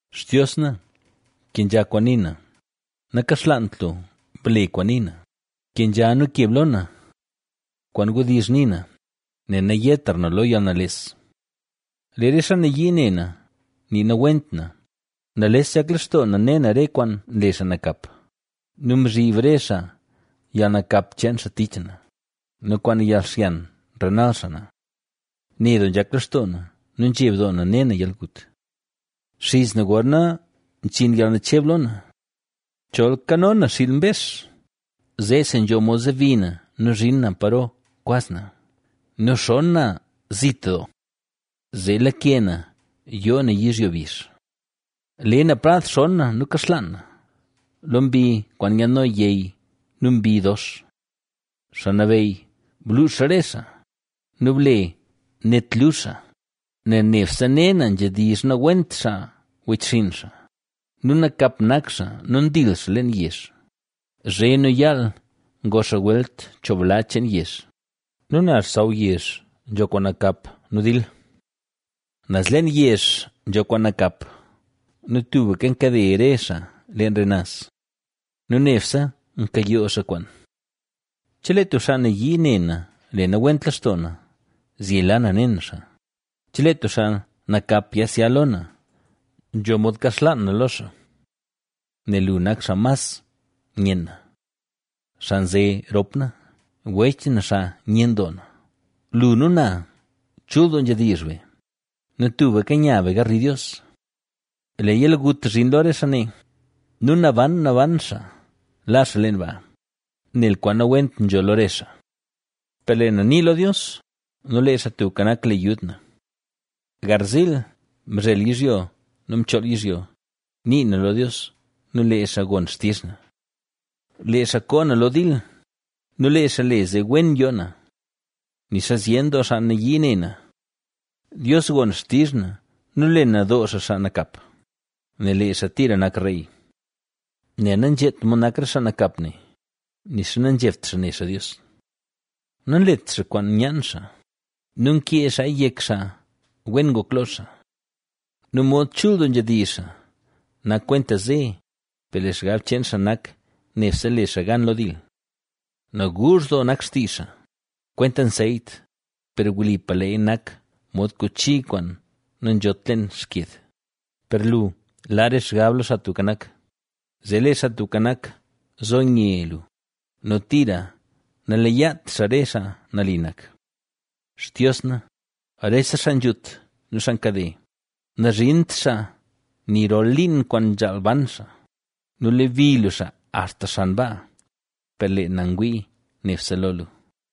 Xtios na, kenzha kwaan nii na; nakaxlaant lu, ble kwaan nii na. Kenzha nu keb lo na. Kwaan wdizh nii na, nel nayetra na lo yalnales. Lee re xaa nayii ne na nii nawent na, nales nzhak lextoo na ne na re kwaan nle xaa nakap nu mzhib xaa re yalnakap cheen xaa tich na nu kwaan yalxyan nrenal xaa na. Ne doo lextoo na nu nzheb doo na ne na yalgut. Nxiz na gorna zhin yalnacheb lo na. ¡Chol kano na xiil mbex, zeesi nzho mod zobi na nu zhin na paro kwaz na! ¡Nu xon na zit doo, zee lake na yoo na yizhyo bizh! Le na prad xon na nu kaxlaan na lo mbi kwaan nyaadno yey nu mbi dox. ¡Xaa Nabeyy, bluux re xaa! ¡Nu ble net luzh xaa! Nel nebse ne na nzhedizh nawent xaa wechxinn xaa nu nakap nak xaa nu ndil xaa leen yezh, zhe nu yaal ngo xaa welt cho bla cheen yezh nu naz xsaw yezh nzho kwaan nakap nu dil. Naz leen yezh nzho kwaan nakap nu tubka nkade re xaa leen re naz nu nebse nkayoo xaa kwaan. Chelee tub xaa nayii ne na le nawent lextoo na, zyela na ne na xaa; chelee tub xaa nakap yasya lo na, nzho mod kaxlaan na lo xaa. ¡Nel lu nak xaa mas nyen na, xaa nze rop na, wech na xaa nyen doo na! Lu nu na, chul doo nzhedizh be nu tuka nya be garli Dios. ¡Lee yalgut zhin lo re xaa ne! ¡Nu naban naban xaa la xaa leen baa, nel kwaan nawent nzho lo re xaa! Per lee na nii lo Dios, nu lee Xaa Tubka Nak le yud na. Garziil, mzhel yizhyo nu mchool yizhyo, nii na lo Dios nu lee xaa gon xtizh na. Lee xaa koo na lo dil nu lee xaa le zee wen yoo na, nixa zyen doo xaa nayii ne na. Dios gon xtizh na nu le nadoo xaa xaa nakap, nel lee xaa tira nak Rey, {Mbaz} Nel nazheet mod nak re xaa nakap ne, nixa nanzhebt xaa ne xaa Dios. Nanlet xaa kwaan nyaan xaa nu nkee xaaya yek xaa wen ngok lo xaa. Nu mod chul doo nzhedizh xaa, nak kwenta ze, per lee xgab cheen xaa nak nebse le xaa gan lo dil. Naguuzh doo nak xtizh xaa, kwenta nseyt, per wlipa leeya nak mod kuchi kwaan nanzhot leen xked. Per lu laa re xgab lo Xaa Tubka Nak, zee lee Xaa Tubka Nak zo nye lu nu tira naleyaat xaa re xaa nali nak. Xtios na, rese xaa nzhut nu xaa nkade, nazhint xaa ni rol liin kwaan nzhaal ban xaa nu lebi lu xaa axta xan baa; per lee na ngwii nebse lo lu.